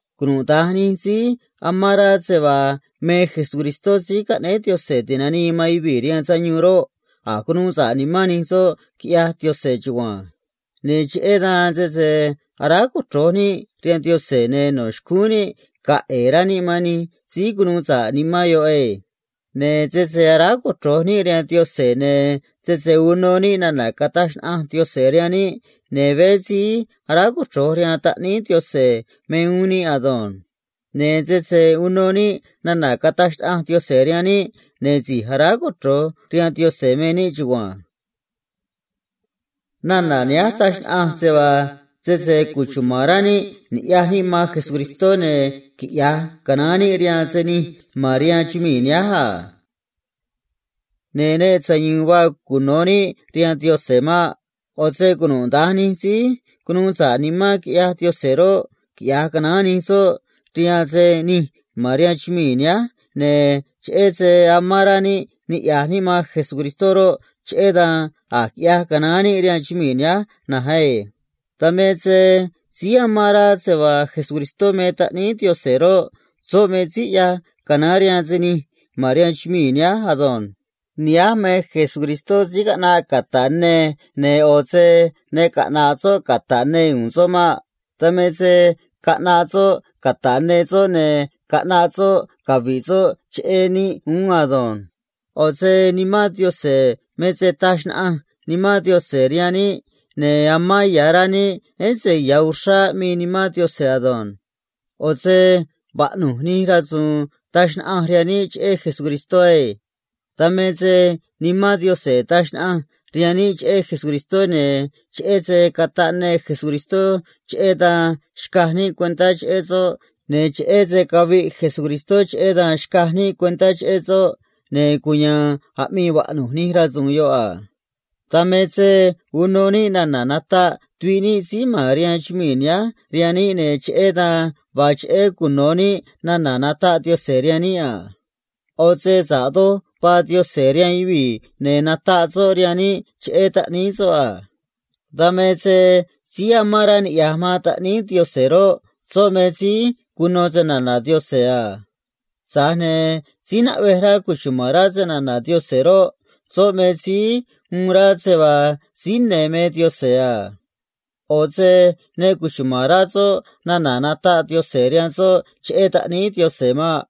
Cunuda̱nj nij síí amán rá se vaa me Jesucristó síí caꞌnéé Diose̱ ti̱nanii man yuvii̱ rihaan sayuun roꞌ, a̱j cunuu sa̱ꞌ nimán nij soꞌ, quiꞌyaj Diose̱ chugua̱nj. Ne̱ cheꞌé dan sese aráj cochro̱j níꞌ rihaan Diose̱, ne̱ no̱ xcúún níꞌ ga̱a̱ ꞌe̱e̱ rá níꞌ man nij síí cunuu sa̱ꞌ nimán yoꞌ ei. Ne̱ sese aráj cochro̱j níꞌ rihaan Diose̱, ne̱ sese uno níꞌ nana̱ cataj xnaꞌanj Diose̱ rihaan níꞌ, ne̱ veé síí aráj cochro̱j rihaan taꞌníí Diose̱ me uún níꞌ ado̱nj. Ne̱ sese uno níꞌ nana̱ cataj xnaꞌanj Diose̱ rihaan níꞌ, ne̱ si̱j aráj cochro̱j rihaan Diose̱ me níꞌ chugua̱nj. Nana̱ nihánj taj xnaꞌanj se vaa sese cuchuma̱n rá níꞌ ni̱ꞌyaj níꞌ man Jesucristó, ne̱ quiꞌya̱j canaán níꞌ rihaan se nij ma̱n rihaan chumii̱ nihánj a Ne̱ ne sayu̱u̱n vaa cuno̱ níꞌ rihaan Diose̱ maꞌ. ꞌO̱ se cunuda̱nj nij síí cunuu sa̱ꞌ nimán quiꞌyaj Diose̱ roꞌ, quiꞌya̱j canaán nij soꞌ rihaan se nij ma̱n rihaan chumii̱ nihánj, ne̱ cheꞌé se amán rá níꞌ niꞌya̱j níꞌ man Jesucristó roꞌ, cheꞌé dan a̱j quiꞌyaj canaán níꞌ rihaan chumii̱ nihánj na̱nj ei. Dan me se síí amán rá se vaa Jesucristó me taꞌníí Diose̱ roꞌ, soꞌ me síí ꞌyaj canaán rihaan se nij ma̱n rihaan chumii̱ nihánj ado̱nj. Nihánj me Jesucristó síí caꞌnaꞌ cata̱ꞌ ne, ne̱ ꞌo̱ se ne caꞌna̱ꞌ soꞌ cata̱ꞌ ne u̱u̱n soꞌ maꞌ. Dan me se caꞌnaꞌ soꞌ cata̱ꞌ ne soꞌ, ne̱ caꞌnaꞌ soꞌ cavi̱ꞌ soꞌ cheꞌé níꞌ uún ado̱nj. ꞌO̱ se Nimán Diose̱ me se taj xnaꞌanj Nimán Diose̱ rihaan níꞌ, ne̱ amán ya̱ rá níꞌ, ése̱ ya̱ uxrá aꞌmii Nimán Diose̱ ado̱nj. ꞌO̱ se vaꞌnu̱j nij rasu̱u̱n taj xnaꞌanj rihaan níꞌ cheꞌé Jesucristó ei. Dan me se Nimán Diose̱ taj xnaꞌanj rihaan níꞌ cheꞌé Jesucristó, ne̱ cheꞌé se cataꞌ ne Jesucristó, cheꞌé dan xcaj níꞌ cuentá cheꞌé soꞌ, ne̱ cheꞌé se caviꞌ Jesucristó, cheꞌé dan xcaj níꞌ cuentá cheꞌé soꞌ, ne̱ cuya̱a̱n aꞌmii vaꞌnu̱j nij rasu̱u̱n yoꞌ a. Dan me se uno níꞌ nana̱ nataꞌ tuviꞌ níꞌ síí ma̱n rihaan chumii̱ nihánj rihaan níꞌ, ne̱ cheꞌé dan vaa cheꞌé cuno̱ níꞌ nana̱ nataꞌ Diose̱ rihaan níꞌ a. ꞌO̱ se sa̱ꞌ doj vaa Diose̱ rihaan yuvii̱, ne̱ nataꞌ soꞌ rihaan níꞌ cheꞌé taꞌníí soꞌ a. Dan me se síí amán rá niꞌya̱j man taꞌníí Diose̱ roꞌ, soꞌ me síí cuno se‑na̱na̱ Diose̱ a. Tza̱j ne̱ síí naꞌvej rá cuchuma̱n rá se‑na̱na̱ Diose̱ roꞌ, soꞌ me síí uun rá se vaa síí ne̱ me Diose̱ a. ꞌO̱ se ne cuchuma̱n rá soꞌ nana̱ nataꞌ Diose̱ rihaan soꞌ cheꞌé taꞌníí Diose̱ maꞌ.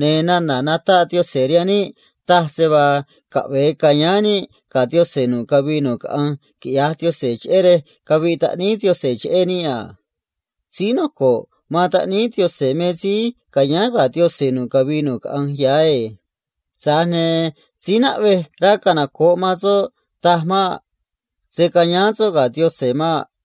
Ne̱ nana̱ nataꞌ Diose̱ rihaan níꞌ taj se vaa caꞌve̱e ca̱yáán níꞌ ga̱ Diose̱ nu̱ꞌ cavii nu̱ꞌ caꞌanj, quiꞌyaj Diose̱, cheꞌé rej caviꞌ taꞌníí Diose̱ cheꞌé níꞌ a. Síí noco̱ꞌ man taꞌníí Diose̱ me síí ca̱yáán ga̱ Diose̱ nu̱ꞌ cavii nu̱ꞌ caꞌanj ya̱ ei. Tza̱j ne̱ síí naꞌvej rá canoco̱ꞌ man soꞌ taj maꞌ. Se̱ cayáán soꞌ ga̱ Diose̱ maꞌ.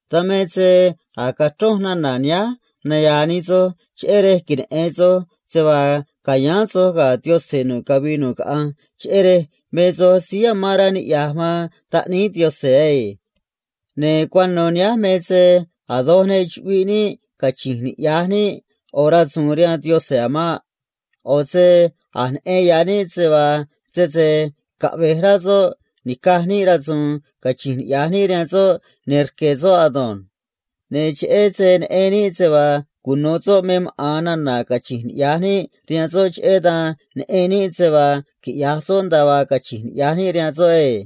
Dan me se a̱j cachronj nana̱ nihánj naya̱a̱ nij soj, cheꞌé rej queneꞌe̱n soj se vaa ca̱yáán soj ga̱ Diose̱ nu̱ꞌ cavii nu̱ꞌ caꞌanj, cheꞌé rej me soj síí amán rá niꞌya̱j man taꞌníí Diose̱ ei. Ne̱ cuano̱ nihánj me se a̱ doj ne chuꞌviꞌ níꞌ cachi̱nj niꞌya̱j níꞌ ꞌo̱ rasu̱u̱n rihaan Diose̱ a̱ maꞌ. ꞌO̱ se a̱j neꞌen ya̱ níꞌ se vaa sese caꞌve̱j rá soꞌ ni̱caj níꞌ rasu̱u̱n cachíín niꞌya̱j níꞌ rihaan soꞌ, ne̱ rque̱ soꞌ ado̱nj. Ne̱ cheꞌé se neꞌen níꞌ se vaa cuno̱ soꞌ me maꞌa̱n nana̱ cachi̱nj niꞌya̱j níꞌ rihaan soꞌ, cheꞌé dan neꞌen níꞌ se vaa quiꞌya̱j soꞌ nda̱a vaa cachi̱nj niꞌya̱j níꞌ rihaan soꞌ ei.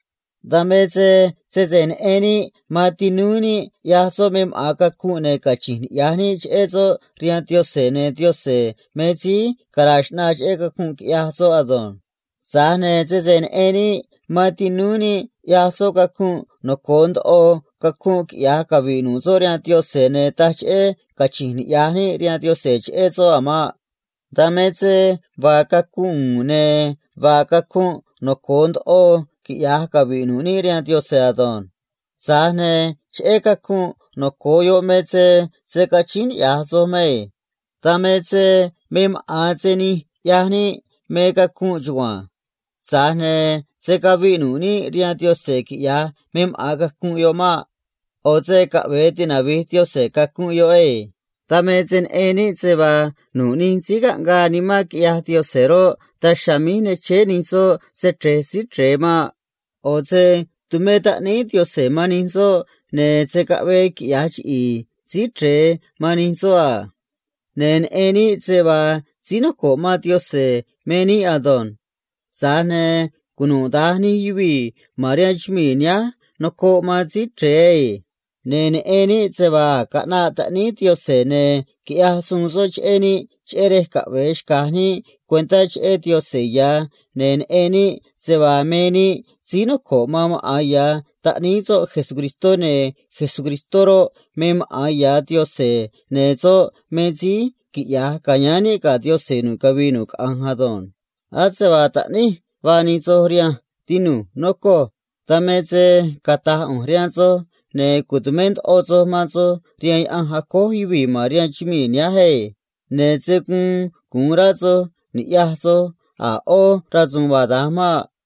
Dan me se sese neꞌen níꞌ tinúú níꞌ ꞌyaj soꞌ me maꞌa̱n cacunꞌ, ne̱ cachi̱nj niꞌya̱j níꞌ cheꞌé soꞌ rihaan Diose̱, ne̱ Diose̱ me síí cara̱a̱ xꞌnaa cheꞌé cacunꞌ quiꞌyaj soꞌ ado̱nj. Tza̱j ne̱ sese neꞌen níꞌ man tinúú níꞌ ꞌyaj soꞌ cacunꞌ noco̱o ndoꞌo cacunꞌ quiꞌya̱j cavi̱ꞌ nu̱ꞌ soꞌ rihaan Diose̱, ne̱ taj cheꞌé cachi̱nj niꞌya̱j níꞌ rihaan Diose̱ cheꞌé soꞌ a̱ maꞌ. Dan me se vaa cacunꞌ u̱u̱n, ne̱ vaa cacunꞌ noco̱o ndoꞌo quiꞌya̱j cavi̱ꞌ nu̱ꞌ níꞌ rihaan Diose̱ ado̱nj. Tza̱j ne̱ cheꞌé cacunꞌ noco̱o yoꞌ me se se̱ cachíín niꞌya̱j soj mei. Dan me se me maꞌa̱n se nij ꞌyaj níꞌ me cacunꞌ chugua̱nj. Tza̱j ne̱ se̱ caviꞌ nu̱ꞌ níꞌ rihaan Diose̱ quiꞌya̱j me maꞌa̱n cacunꞌ yoꞌ maꞌ. ꞌO̱ se caꞌve̱e tinavi̱j Diose̱ cacunꞌ yoꞌ ei. Dan me se neꞌen níꞌ se vaa nu̱ꞌ nij síí caꞌngaa nimán quiꞌyaj Diose̱ roꞌ, daj chiha̱a̱ míj ne chéé nij soꞌ xrej síí chre̱e maꞌ. ꞌO̱ se tumé taꞌníí Diose̱ man nij soꞌ, ne̱ se̱ caꞌvee quiꞌya̱j chiꞌi̱i̱ síí chre̱e man nij soꞌ a. Ne̱ neꞌen níꞌ se vaa síí noco̱ꞌ man Diose̱ me níꞌ ado̱nj. Tza̱j ne̱ cunuda̱nj nij yuvii̱ ma̱n rihaan chumii̱ nihánj nocoꞌ man síí chre̱e ei. Ne̱ neꞌen níꞌ se vaa a̱j caꞌnaꞌ taꞌníí Diose̱, ne̱ quiꞌyaj suun soꞌ cheꞌé níꞌ, cheꞌé rej caꞌve̱e xca̱j níꞌ cuentá cheꞌé Diose̱ ya̱, ne̱ neꞌen níꞌ se vaa me níꞌ síí noco̱ꞌ man maꞌa̱n ya̱ taꞌníí soꞌ Jesucristó, ne̱ Jesucristó roꞌ, me maꞌa̱n ya̱ Diose̱, ne̱ soꞌ me síí quiꞌya̱j ca̱yáán níꞌ ga̱ Diose̱ nu̱ꞌ cavii nu̱ꞌ caꞌanj ado̱nj. Ase vaa taꞌníj vaa nij soj rihanj, tinu̱j, nocoj. Dan me se cata̱j ꞌu̱nj rihaan soj, ne̱ cu̱tumé ndoꞌo soj man soj rihaan yaꞌanj acój yuvii̱ ma̱n rihaan chumii̱ nihánj ei. Ne̱ se̱ guun gu̱un rá soj ni̱ꞌyaj soj a̱ ꞌó rasu̱u̱n vaa da̱nj maꞌ.